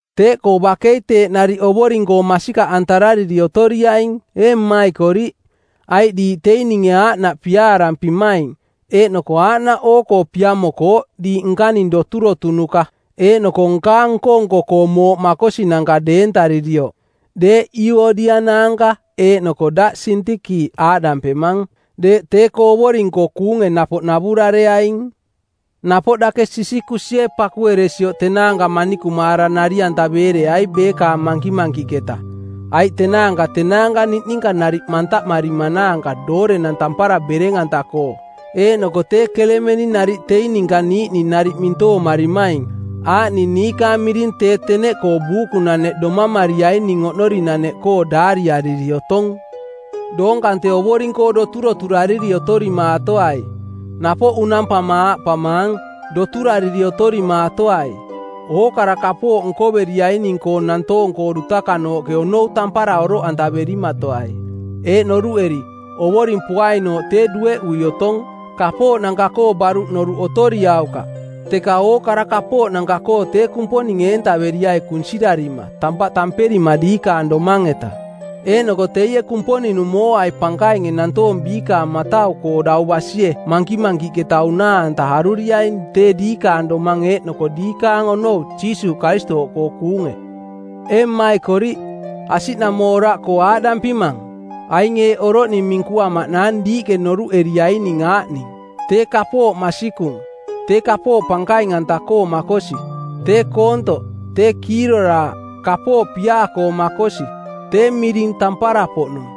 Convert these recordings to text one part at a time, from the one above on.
Teeꞌkoo bakei teeꞌ nariꞌ Ovoring-koo masikaꞌantarariri otoriaing, ee mmaikoriꞌ, aiꞌ diiꞌ teing ninge aaꞌnaꞌ piaarampimaing, eeꞌnoko aaꞌnaꞌ oo-koo piamokooꞌ diiꞌ nkaning doturotunuka eeꞌnoko nkaang nko-nko-koo mooꞌ makosinanka deentaririoꞌ. Deeꞌ Iuodia naanka eeꞌnoko daꞌ Sintiki aaꞌdampemang, deeꞌ tee-koo Ovoring-koo kuunge napoꞌ navurareaing. Napoꞌ dake Sisikusie pakueresioꞌ tenaanka manikumaara nari-antaveereai beekaang mankimankiꞌketa, aiꞌ tenaanka tenaanka niꞌninka nariꞌ mantaꞌmarimanaanka doorenang tampara bereng-anta-koo eeꞌnoko tee Kelemeni nariꞌ teing ninka niiꞌning nariꞌ mintoomarimaing, aaꞌning niikaang miring tee teneꞌkoo buukunaneꞌ domamariaining oꞌnorinaneꞌkoo daariariri otong. Doong kante Ovoring-koo doturoturariri otorimaatoai, napoꞌ unampama aaꞌpamaang, Doturariri otorimaatoai! Ookara kapooꞌ nkoveriaining-koo nantoong-koo dutakanooꞌke onou tampara oroꞌantaverimatoai, eeꞌ noruꞌeri, Ovoring poainooꞌ tee dueꞌui otong. Kapooꞌnanka-koo baruꞌ noruꞌ otoriaukaꞌ, teka ookara kapooꞌnanka-koo tee Kumponing eentaveriai kunsirarima tampaꞌ tamperima diikaang domang-eta. Eeꞌnoko teie Kumponing-nung mooai pankainge nantoong biikaang matau-koo dau basie mankimankiꞌketa unaa-anta aruriaing tee diikaang domang eeꞌnoko diikaang onou Jiisuuꞌ Karistooꞌkoo kuunge. Ee mmaikoriꞌ, asiꞌnamooraꞌkoo aaꞌdampimang, “Aing eeꞌ oroꞌning minkuamaꞌnaang diiꞌke norunoruꞌeriaining aaꞌning: tee kapooꞌ masikung, tee kapooꞌ pankaing-anta-koo makosi, tee koontoꞌ, tee kiiroraaꞌ, kapooꞌ piaa-koo makosi, tee miring tampara-poꞌnung.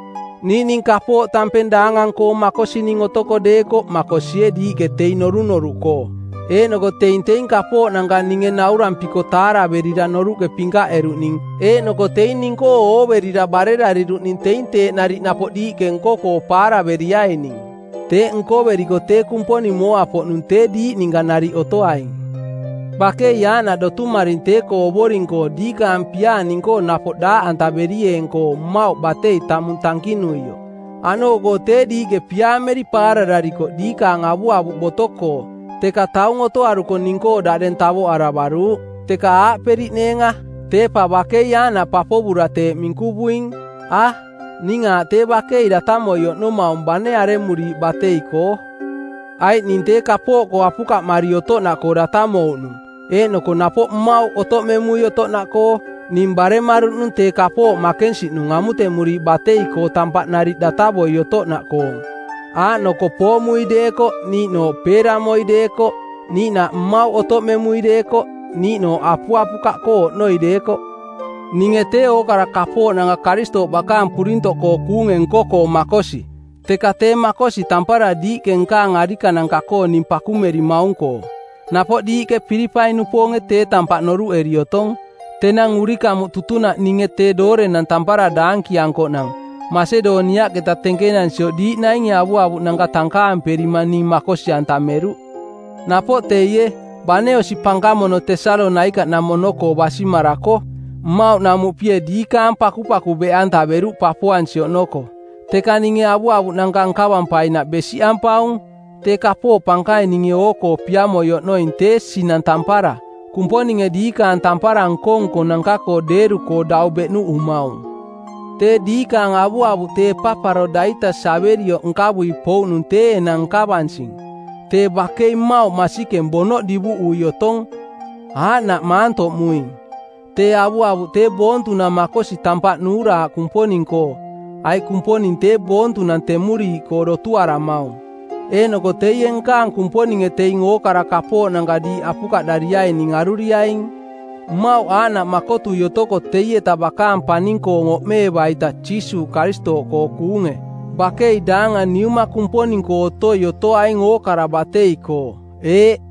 Niiꞌning kapooꞌ tampeng daangang-koo makosining otoko deekoꞌ makosie diiꞌke teing norunoruꞌkoo. Eeꞌnoko teing teing kapooꞌnanka ninge naurampiko taaraverira noruꞌke pinkaꞌeruꞌning eeꞌnoko teing ning-koo ooverira barerariruꞌning teing teeꞌ nariꞌ napoꞌ diiꞌke nko-koo paaraveriaining. Teeꞌ nkoveriko tee Kumponing mooa-poꞌnung tee diiꞌ ninka nariꞌ otoaing.” Bakei aaꞌnaꞌ dotumaring tee-koo Ovoring-koo diikaang piaa ning-koo napoꞌ daaꞌantaverieeng-koo mmauꞌ batei tamung tankinuioꞌ. Aꞌnooꞌkoo tee diiꞌke piaameri paarararikoꞌ diikaang avuavuꞌ boto-koo, teka taung otoaruko ning-koo daꞌdeng tavoꞌaravaruuꞌ. Teka aaꞌperiꞌneenga, “Tee pa bakei aaꞌnaꞌ papovura teeꞌ minkuvuing.” A, ning aaꞌ tee bakei datamoi oꞌnomaung bane aremuriiꞌ batei-koo. Aiꞌ ning tee kapooꞌkoo apukaꞌmari otoꞌnaꞌkoo datamouꞌnung eeꞌnoko napoꞌ mmauꞌ otoꞌmemui otoꞌnaꞌkoo. Ning baremaruꞌnung tee kapooꞌ makensiꞌnung amutemuriiꞌ batei-koo tampaꞌ nariꞌ datavoi otoꞌnaꞌkoong, aaꞌnoko poomui deekoꞌ niiꞌnooꞌ peeramoi deekoꞌ, niiꞌnaꞌ mmauꞌ otoꞌmemui deekoꞌ niiꞌnooꞌ apuapukaꞌkoo oꞌnoi deekoꞌ. Ninge tee ookara kapooꞌnanka Karistooꞌ bakaang purintoꞌkoo kuunge nko-koo makosi. Teka tee makosi tampara diiꞌke nkaang arikananka-koo ning pakumerimaung-koo. Napoꞌ diiꞌke Pilipai-nupoonge tee tampaꞌ noruꞌeri otong, tenang urikamuꞌ tutunaꞌ ninge tee doorenang tampara daankiankoꞌnang, Masedoniaꞌketa tenkenansioꞌ diiꞌ nainge avuavuꞌnanka tankaamperima ning makosi-antameruꞌ. Napoꞌ teie, bane osi pankamono Tesalonaikaꞌnamono-koo basimarako, mmauꞌnamuꞌpie diikaang pakupaku beꞌantaveruꞌ papoansi oꞌnoko. Teka ninge avuavuꞌnanka nkavampainaꞌ besiꞌampaung. Tee kapooꞌ pankaing ninge oo-koo piamoi oꞌnoing tee sinang tampara, Kumponinge diikaang tampara nko-nkonanka-koo deeru-koo dau beꞌnuꞌumaung. Tee diikaang avuavuꞌ tee Epaparodaitas averioꞌ nkavui pouꞌnung tee enang nkavansing. Tee bakei mmauꞌ masikeng bonoꞌ divuꞌui otong. Aaꞌnaꞌ maantoꞌmuing. Tee avuavuꞌ tee boontunang makosi tampaꞌ nuuraaꞌ Kumponing-koo, aiꞌ Kumponing tee boontunang temuriiꞌkoo dotuaramaung. Eeꞌnoko teie nkaang Kumponinge teing ookara kapooꞌnanka diiꞌ apukaꞌdariaining aruriaing, mmauꞌ aaꞌnaꞌ makotui otoko teieta bakaang paning-koong oꞌmeeva-ita Jiisuuꞌ Karistooꞌkoo kuunge. Bakei daangang Niuma Kumponing-koo otoi otoaing ookara batei-koo. Eeꞌ.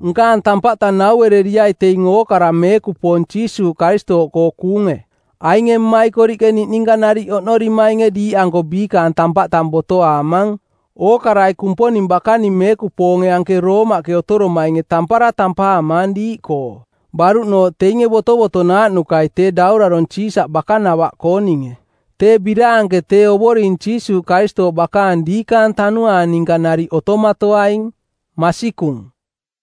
Nkaang tampaꞌ tang nauereriai teing ookara meekupoong Jiisuuꞌ Karistooꞌkoo kuunge. Ainge mmaikoriꞌke niꞌninka nariꞌ oꞌnorimainge diiꞌanko biikaang tampaꞌ tang botoaamang. Ookarai Kumponing bakaning meekupoonge anke Roomaꞌke otoromainge tampara tampaamaang diiꞌkoo, baruꞌnooꞌ teinge botovotonaaꞌnukai tee daurarong˜ Siisaꞌ bakanavaꞌkooninge. Tee biraanke tee Ovoring Jiisuuꞌ Karistooꞌ bakaang diikaang tanuaang ninka nariꞌ otomatoaing. Masikung.